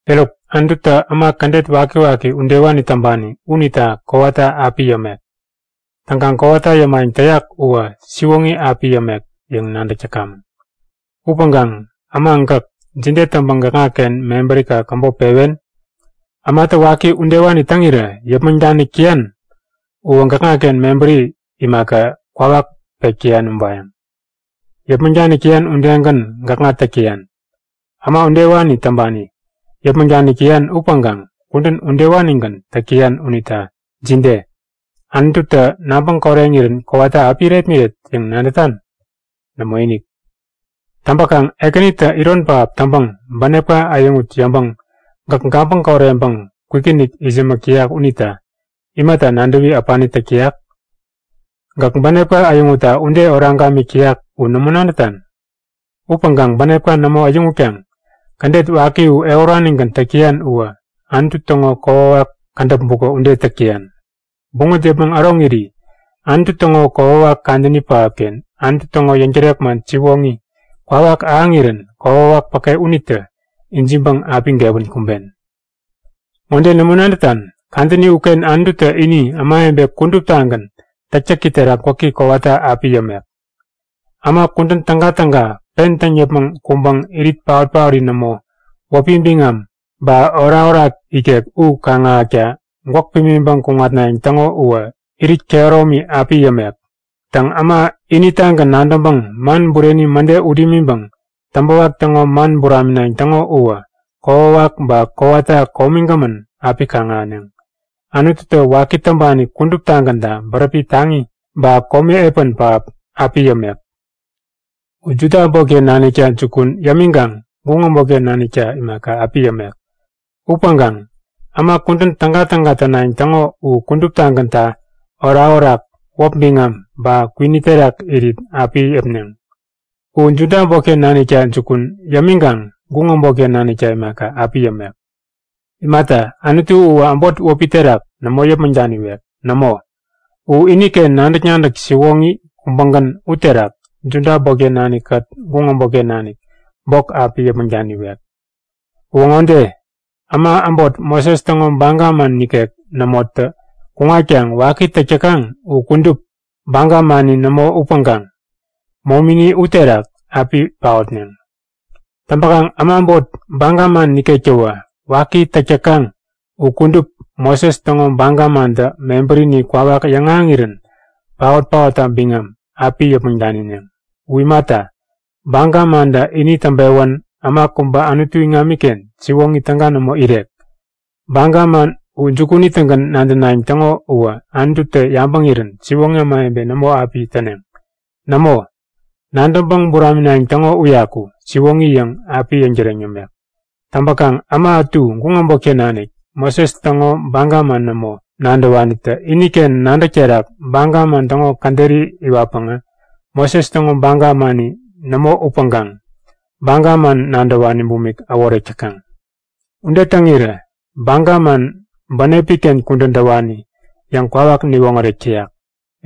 Eruk, Anututä äma kädet wakiwaki udewani täŋpani unita kowata api yämek. Täŋkaŋ kowata yämayäŋ täyak uwä siwoŋi api yämek yäŋ nadäk täkamäŋ. Upäŋkaŋ äma gäk, jide täŋpäŋ gäkŋaken mebärika käbop pewen? Ämatä waki udewani täŋirä yäpmäŋ danik täyan uwä gäkŋaken mebäri imaka, kwawak pek täyan ubayäŋ. Yäpmäŋ danik täyan udegän gäkŋa täk täyan. Äma udewani täŋpani yäpmäŋ danik täyan upäŋkaŋ kudän udewanigän täk täyan unita jide? Anututä nabäŋ koreŋirän kowata api irepmiret yäŋ nadätan? Nämoinik! Täŋpäkaŋ Ekänitä iron pähap täŋpäŋ bänepka äyäŋut yäŋpäŋ gäk gabäŋ koreŋpäŋ kwikinik itsämäk täyak unita imata nadäwi äpani täk täyak? Gäk bänepka äyäŋutta ude oraŋ gamik täyak u nämo nadätan? Upäŋkaŋ bänepka nämo äyäŋutkaŋ kädet waki u ehuranigän täk täyan uwä Anutu täŋo kokwawak kädäp bukä ude täk täyan. Buŋät yäpmäŋ äroŋiri Anutu täŋo kokwawak kadäni pähapken Anutu täŋo yäŋtärek man siwoŋi kwawak ahäŋirän kokwawak päke unitä ijiŋpäŋ api gewän kumben. Ŋode nämo nadätan? Kadäni uken Anututä ini ämawebe kuduptagän täktäki terak gwäki kowata api yämek. Äma kudän tägatäga pen täŋ yäpmäŋ kuŋpäŋ irit paot-paori nämo, wäpi biŋam ba orakorak ikek u kaŋ-ahäkta gwäk pimiŋpäŋ kuŋatnayäŋ täŋo uwä irit kehäromi api yämek. Täŋ, äma initagän nadäŋpäŋ man bureni mäde ut imiŋpäŋ täŋpäwak täŋo man buraminayäŋ täŋo uwä kokwawak ba kowata komigämän api kaŋ-ahäneŋ. Anututä waki täŋpani kuduptagänta bäräpi taŋi ba komi epän pähap api yämek. U Juda äbotken nanikta jukun yämiŋkaŋ guŋ äbotken nanikta imaka, api yämek. Upäŋkaŋ äma kudän tägatäga tänayäŋ täŋo u kuduptagänta orakorak, wäp biŋam ba kwini terak irit api yäpneŋ. U Juda äbotken nanikta jukun yämiŋkaŋ guŋ äbotken nanikta imaka, api yämek. Imata, Anutu uwä äbot wäpi terak nämo api yäpmäŋ daniwek. Nämo, u iniken nadäk-nadäk siwoŋi kubägän u terak Juda äbotken nanikkät guŋ äbotken nanik bok api yäpmäŋ daniwek. Uwä ŋode; Äma äbot Moses täŋo baga man nikek nämotä kuŋatkaŋ waki täk täkaŋ u kudup, baga mani nämo upäŋkaŋ momini uterak api paotneŋ. Täŋpäkaŋ äma äbot baga man nikektäwä waki täk täkaŋ u kudup Moses täŋo baga mantä mebärini kwawak yäŋahäŋirän paot-paotta biŋam api yäpmäŋ danineŋ. U imata, baga mantä ini täŋpewän äma kubä Anutu iŋamiken siwoŋi täga nämo irek. Baga man u jukunitägän nadänayäŋ täŋo uwä Anututä yabäŋirän siwoŋi ämawebe nämo api täneŋ. Nämo, nadäŋpäŋ buraminayäŋ täŋo uyaku, siwoŋi yäŋ api yäŋtäreŋ yämek. Täŋpäkaŋ äma ätu guŋ äbotken nanik, Moses täŋo baga man nämo nadäwanitä iniken nadäk terak baga man täŋo käderi iwatpäŋä, Moses täŋo baga mani nämo upäŋkaŋ baga man nadäwani bumik äworek täkaŋ. Ude täŋirä baga man bänepi-ken kudän täwani yäŋ kwawak niwoŋärek täyak.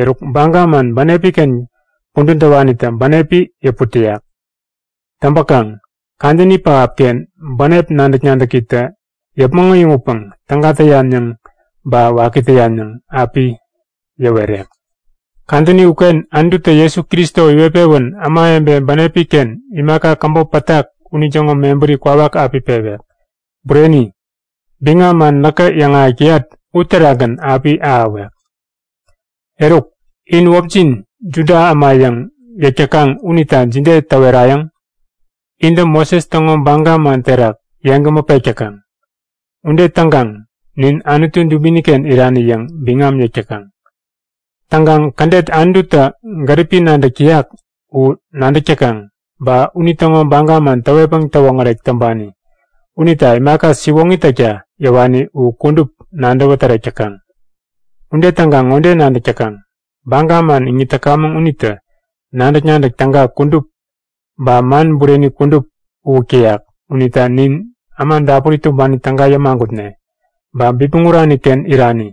Eruk, baga man bänepi-ken kudän täwanitä bänepi yäput täyak. Täŋpäkaŋ kadäni pähapken bänep nadäk-nadäkitä yäpmäŋ äyäŋutpäŋ täga täyan yäŋ ba waki täyan yäŋ api yäwerek. Kadäni uken Anututä Jesu Kristo iwet-pewän ämawebe bänepi-ken imaka käbop pätak unitäŋo mebäri kwawak api pewek. Bureni, biŋam man näkä yäŋahäk täyat uterakgän api ahäwek. Eruk, in wäpjin Juda äma yäŋ yäk täkaŋ unita jide täwerayäŋ? Intä Moses täŋo baga man terak yeŋgämä pek täkaŋ. Ude täŋkaŋ nin Anutu dubini-ken irani yäŋ biŋam yäk täkaŋ. Täŋkaŋ kädet Anututä gäripi nadäk täyak u nadäk täkaŋ, ba unitäŋo baga man täwetpäŋ täwoŋärek täŋpani unita imaka siwoŋi täkta yäwani u kudup nadäwä tärek täkaŋ. Ude täŋkaŋ ŋode nadäk täkaŋ; Baga man iŋit täkamäŋ unitä nadäk-nadäk täga kudup ba man bureni kudup uwäk täyak unita nin äma dapuri tumbani täga yämagutne, ba bipmäŋ urani-ken irani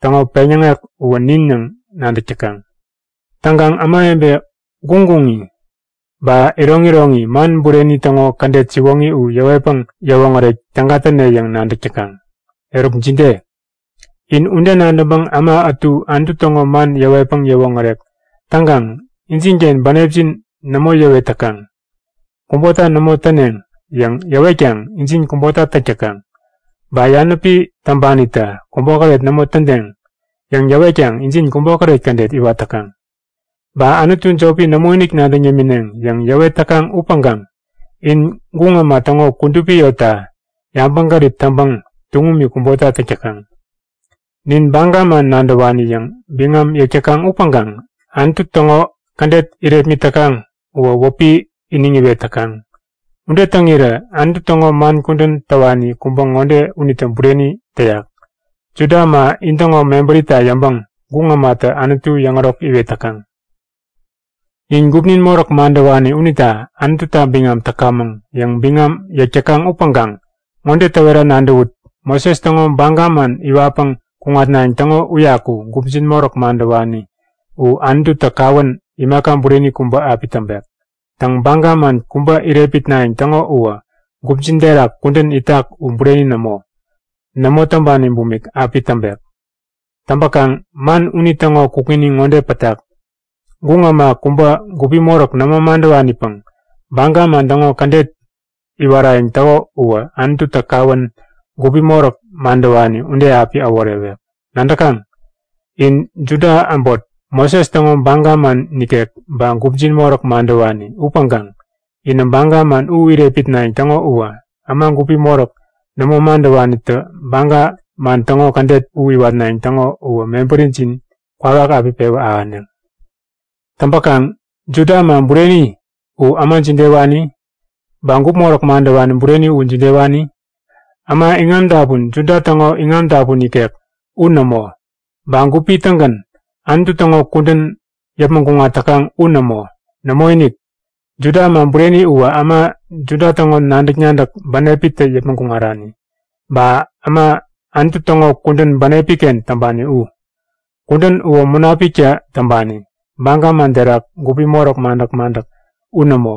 täŋo peŋyäŋek uwä nin yäŋ nadäk täkaŋ. Täŋkaŋ ämawebe guŋguŋi, ba iroŋiroŋi man bureni täŋo kädet siwoŋi u yäwetpäŋ yäwoŋärek täga täne yäŋ nadäk täkaŋ. Eruk jide? In ude nadäŋpäŋ äma ätu Anutu täŋo man yäwetpäŋ yäwoŋärek täŋkaŋ injinken bänepjin nämo yäwet täkaŋ. Kubota nämo täneŋ yäŋ yäwetkaŋ injin kubota täk täkaŋ. Ba yanäpi täŋpanitä kubokäret nämo tädeŋ yäŋ yäwetkaŋ injin kubokäret kädet iwat täkaŋ. Ba anutu jopi nämoinik nadäŋ yämineŋ yäŋ yäwet täkaŋ upäŋkaŋ in guŋ äma täŋo kudupi yotta yabäŋgärip täŋpäŋ tuŋumi kubota täk täkaŋ. Nin baga man nadäwani yäŋ biŋam yäk täkaŋ upäŋkaŋ Anutu täŋo kädet irepmit täkaŋ uwä wäpi iniŋ iwet täkaŋ. Ude täŋirä Anutu täŋo man kudän täwani kubä ŋode unitä bureni täyak; Juda äma intäŋo mebärita yäŋpäŋ guŋ ämatä Anutu yäŋärok iwet täkaŋ. Nin gupnin moräk madäwani unita Anututa biŋam täkamäŋ yäŋ biŋam yäk täkaŋ upäŋkaŋ ŋode täwera nadäwut; Moses täŋo Baga man iwatpäŋ kuŋatnayäŋ täŋo uyaku gupjin moräk madäwani u Anututä kawän imaka bureni kubä api täŋpek. Täŋ, baga man kubä irepmitnayäŋ täŋo uwä gupjin terak kudän itak u bureni nämo, nämo täŋpani bumik api täŋpek. Täŋpäkaŋ man unitäŋo kukŋini ŋode pätak; Guŋ äma kubä gupi moräk nämo madäwanipäŋ baga man täŋo kädet iwarayäŋ täko uwä Anututä kawän gupi moräk madäwani ude api äworewek. Nadäkaŋ? In Juda äbot Moses täŋo baga man nikek ba gupjin moräk madäwani upäŋkaŋ inä baga man u irepmitnayäŋ täŋo uwä, äma gupi moräk nämo madäwanitä baga man täŋo kädet u iwatnayäŋ täŋo uwä mebärijin kwawak api pewä ahäneŋ. Täŋpäkaŋ Juda äma bureni u äma jidewani? Ba gup moräk madäwani bureni u jidewani? Äma iŋami dapun Juda täŋo iŋam dapun ikek u nämo, ba gupi-tägän Anutu täŋo kudän yäpmäŋ kuŋat täkaŋ u nämo! Nämoinik! Juda äma bureni uwä äma Juda täŋo nadäk-nadäk bänepitä yäpmäŋ kuŋarani. Ba äma Anutu täŋo kudän bänepi-ken täŋpani u. Kudän uwä Munapiktä täŋpani, baga man terak gupi moräk madäk-madäk u nämo.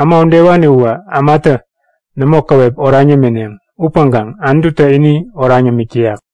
Äma udewani uwä ämatä nämo käwep oraŋ yämineŋ. Upäŋkaŋ Anututä ini oraŋ yämik täyak.